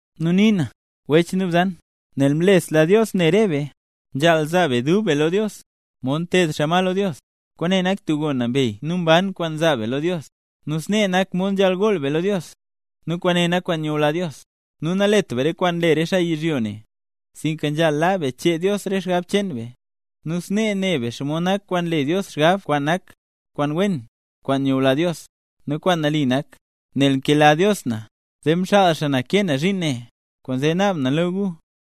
Nu nii na, wech nu bzan, nel mlesla Dios ne re be, nzhaal zaa be dub be lo Dios; mod nteed xaa ma lo Dios. Kwaane nak tub gon nambey nu mban kwaan nzaa be lo Dios, nu snee nak mod nzhaal gool be lo Dios; nu kwaane nak kwaan nyula Dios. Nu nalet be re kwaan nle re xaa yizhyo ne, sinka nzhaal laa be chee Dios re xgab cheen be, nu snee ne be xomod nak kwaan nle Dios xgab kwaan nak kwaan wen, kwaan nyula Dios, nu kwaan nali nak. Nel nkela Dios na, zee mxaal xaa na kee na zhiin ne, kwaanzee naab na lo gu,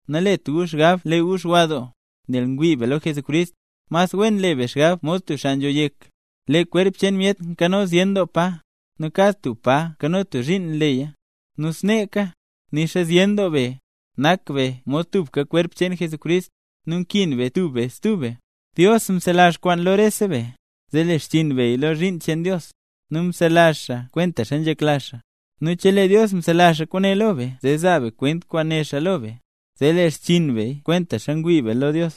nalet gu xgab lee gu xwa doo. Nel ngwii be lo Jesucrist, mas wen le be xgab mod tub xaa nzho yek. Lee kwerp cheen myet nkano zyen doo pa, nu kad tub pa nkano tub zhiin nleya. Nu sneeka, nixa zyen doo be, nak be mod tubka kwerp cheen Jesucrist, nu nkin be tub be stub be. Dios mzelazh kwaan lo rese be, zee le xchiin beya lo zhiin cheen Dios, nu mzelazh xaaya kwentaxa nzhekla xaa. Nu chelee Dios mzelazh kwaane lo be zee zaa be kwent kwaan né xaa lo be, zee le xchiin beya konxa ngwii be lo Dios.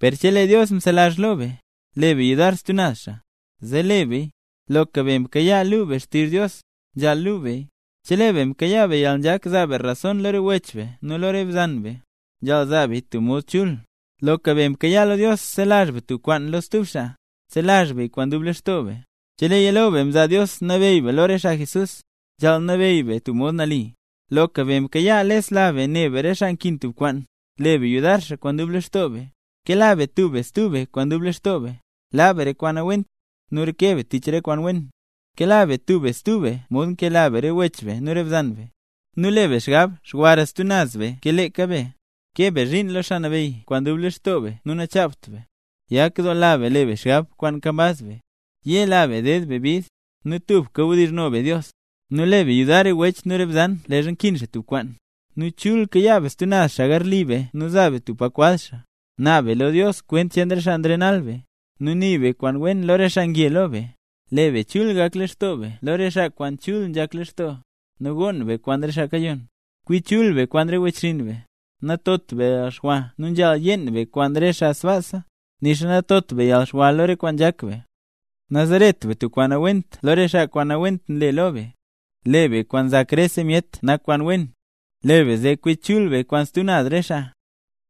Per chelee Dios mzelazh lo be, le be yudar stub naz xaa, zee le beya. Loka be mkayaa lu be xtizh Dios, nzhaal luu beya. Chelee be mkayaa be yalnzhak zaa be rason lo re wech nu lo re bzan, nzhaal zaa beya tub mod chul. Loka be mkayaa lo Dios zelazh be tub kwaan lo stub xaa, zelazh beya kwaan dub lextoo be. Cheleeya lo be mzaa Dios nabeyy be lo re xaa Jesús, nzhaal nabeyy be tub mod nali. Loka be mkayaa lesla be ne be re xaa nkin tub kwaan, le be yudar xaa kwaan dub lextoo be. Kela be tub be stub be kwaan dub lextoo be. Laa be re kwaan nawent, nu reke be tich re kwaan wen. Kela be tub be stub be mod nkela be re wech be nu re bzan be, nu le be xgab xwara stub be ke leeka be. Kee be zhiin lo Xaa Nabeyy kwaan dub lextoo be nu nachaabt be. Yakdoola be le be xgab kwaan nkambaz be; yela be ded be bid, nu tubka wdizhno be Dios. Nu le be yudar re wech nu re bzan leezha nkin xaa tub kwaan. Nu chul kayaa be stub naz xaa zhin garli be nu zaa be tub pa kwaz xaa. Naab be lo Dios kwent cheen re xaa nrenal be; nu nii be kwaan wen lo re xaa nge lo be. Le be chul gak lextoo be lo re xaa kwaan chul nzhak lextoo, nu gonn be kwaan re xaa kayonn. Kwi chul be kwaan re wechxinn be. Natot be yalxwa nu nzhaal yeen be kwaan re xaa sbaasa, nixa natot be yalxwa lo re kwaan nzhak be. Nazaret be tub kwaan nawent lo re xaa kwaan nawent nle lo be. Le be kwaan nzak rese myet nak kwaan wen. Le be zee kwi chul be kwaan stub naz re xaa,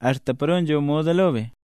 axta paro nzho moda lo be.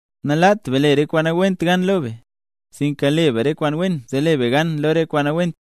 Nalaat be le re kwaan nawent gan lo be, sinka le be re kwaan wen zee le be gan lo re kwaan nawent.